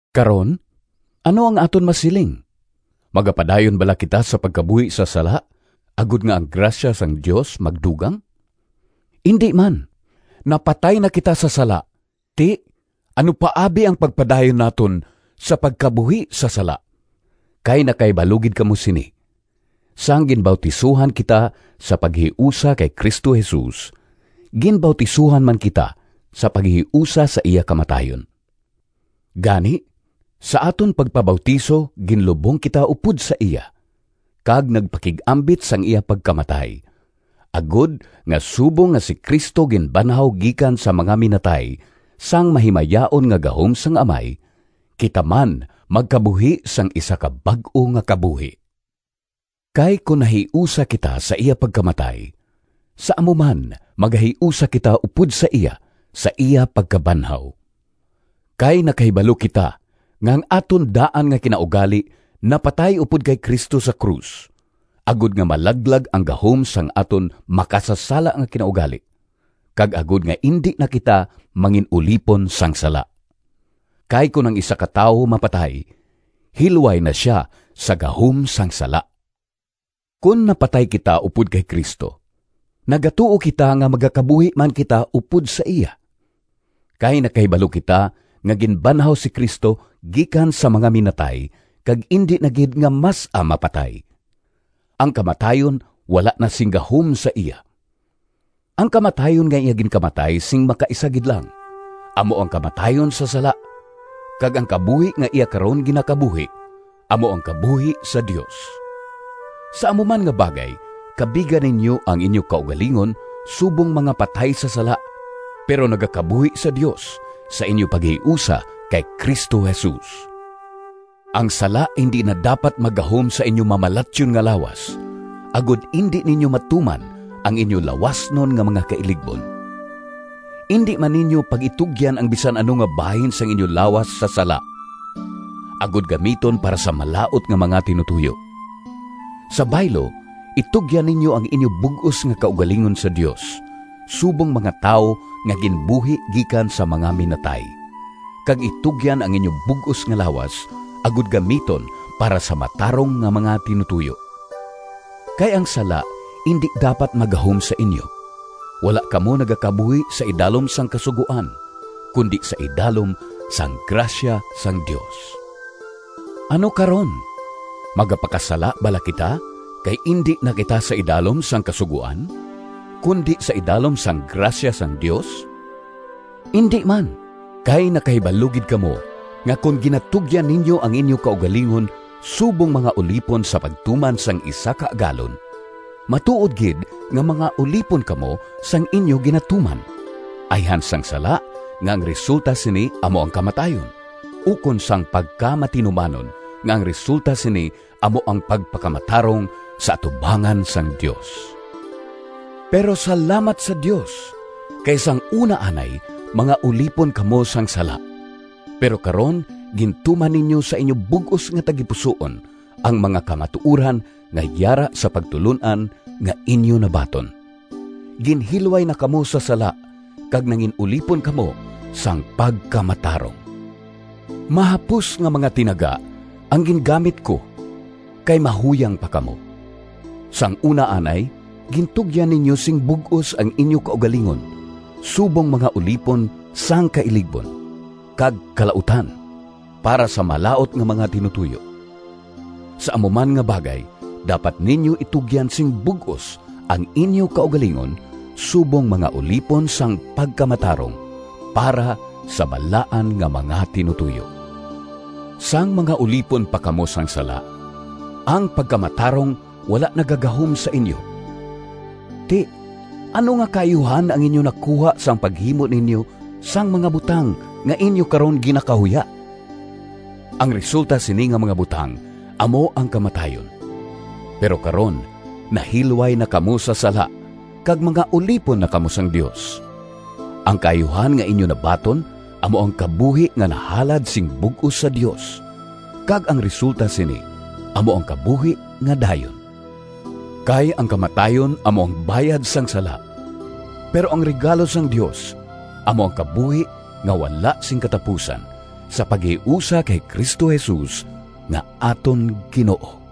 Karon ano ang aton masiling? Magapadayon bala kita sa pagkabuhi sa sala, agod nga ang grasya sang Dios magdugang? Indi man! Napatay na kita sa sala—ti ano pa abi ang pagpadayon naton sa pagkabuhi sa sala? Kay nakahibalo gid kamo sini: sang ginbautisohan kita sa paghiusa kay Cristo Jesus, ginbautisohan man kita sa paghiusa sa iya kamatayon. Gani, sa aton pagpabautiso, ginlubong kita upod sa iya, kag nagpakig-ambit sang iya pagkamatay, agod nga, subong nga si Cristo ginbanhaw gikan sa mga minatay sang mahimayaon nga gahom sang Amay, kita man magkabuhi sang isa ka bag-o nga kabuhi. Kay kon nahiusa kita sa iya pagkamatay, sa amo man magahiusa kita upod sa iya, sa iya pagkabanhaw. Kay nakahibalo kita nga ang aton daan nga kinaugali napatay upod kay Cristo sa krus, agod nga malaglag ang gahom sang aton makasasala nga kinaugali, kag agod nga indi na kita mangin-ulipon sang sala. Kay kon ang isa ka tawo mapatay, hilway na sia sa gahom sang sala. Kon napatay kita upod kay Cristo, nagatuo kita nga magakabuhi man kita upod sa iya. Kay nakahibalo kita nga ginbanhaw si Cristo gikan sa mga minatay kag indi na gid nga mas-a mapatay—ang kamatayon wala na sing gahom sa iya. Ang kamatayon nga iya ginkamatay sing makaisa gid lang, amo ang kamatayon sa sala, kag ang kabuhi nga iya karon ginakabuhi amo ang kabuhi sa Dios. Sa amo man nga bagay kabiga ninyo ang inyo kaugalingon subong mga patay sa sala, pero nagakabuhi sa Dios sa inyo paghiusa kay Cristo Jesus. Ang sala indi na dapat maggahom sa inyo mamalatyon nga lawas, agod indi ninyo matuman ang inyo lawasnon nga mga kailigbon. Indi man ninyo pag-itugyan ang bisan ano nga bahin sang inyo lawas sa sala, agod gamiton para sa malaut nga mga tinutoyo. Sa baylo, itugyan ninyo ang inyo bug-os nga kaugalingon sa Dios, subong mga tawo nga ginbuhi gikan sa mga minatay, kag itugyan ang inyo bug-os nga lawas, agod gamiton para sa matarong nga mga tinutoyo. Kay ang sala indi dapat maggahom sa inyo. Wala kamo nagakabuhi sa idalom sang kasugoan, kundi sa idalom sang grasya sang Dios. Ano karon? Magapakasala bala kita, kay indi na kita sa idalom sang kasugoan, kundi sa idalom sang grasya sang Dios? Indi man! Kay nakahibalo gid kamo nga kon ginatugyan ninyo ang inyo kaugalingon subong mga ulipon sa pagtuman sang isa ka agalon, matuod gid nga mga ulipon kamo sang inyo ginatuman—ayhan sang sala, nga ang resulta sini amo ang kamatayon, ukon sang pagkamatinumanon, nga ang resulta sini amo ang pagpakamatarong sa atubangan sang Dios. Pero salamat sa Dios! Kay sang una anay mga ulipon kamo sang sala, pero karon gintuman ninyo sa inyo bug-os nga tagipusoon ang mga kamatuoran nga yara sa pagtulon-an nga inyo nabaton. Ginhilway na kamo sa sala kag nangin-ulipon kamo sang pagkamatarong. Mahapos nga mga tinaga ang gingamit ko, kay mahuyang pa kamo. Sang una anay gintugyan ninyo sing bug-os ang inyo kaugalingon subong mga ulipon sang kailigbon kag kalautan para sa malaut nga mga tinutoyo. Sa amo man nga bagay dapat ninyo itugyan sing bug-os ang inyo kaugalingon subong mga ulipon sang pagkamatarong para sa balaan nga mga tinutoyo. Sang mga ulipon pa kamo sang sala, ang pagkamatarong wala nagagahom sa inyo. Ti, ano nga kaayuhan ang inyo nakuha sang paghimo ninyo sang mga butang nga inyo karon ginakahuya? Ang resulta sini nga mga butang amo ang kamatayon! Pero karon, nahilway na kamo sa sala kag mga ulipon na kamo sang Dios; ang kaayuhan nga inyo nabaton amo ang kabuhi nga nahalad sing bug-os sa Dios, kag ang resulta sini amo ang kabuhi nga dayon. Kay ang kamatayon amo ang bayad sang sala, pero ang regalo sang Dios amo ang kabuhi nga wala sing katapusan sa paghiusa kay Cristo Jesus nga aton Ginoo.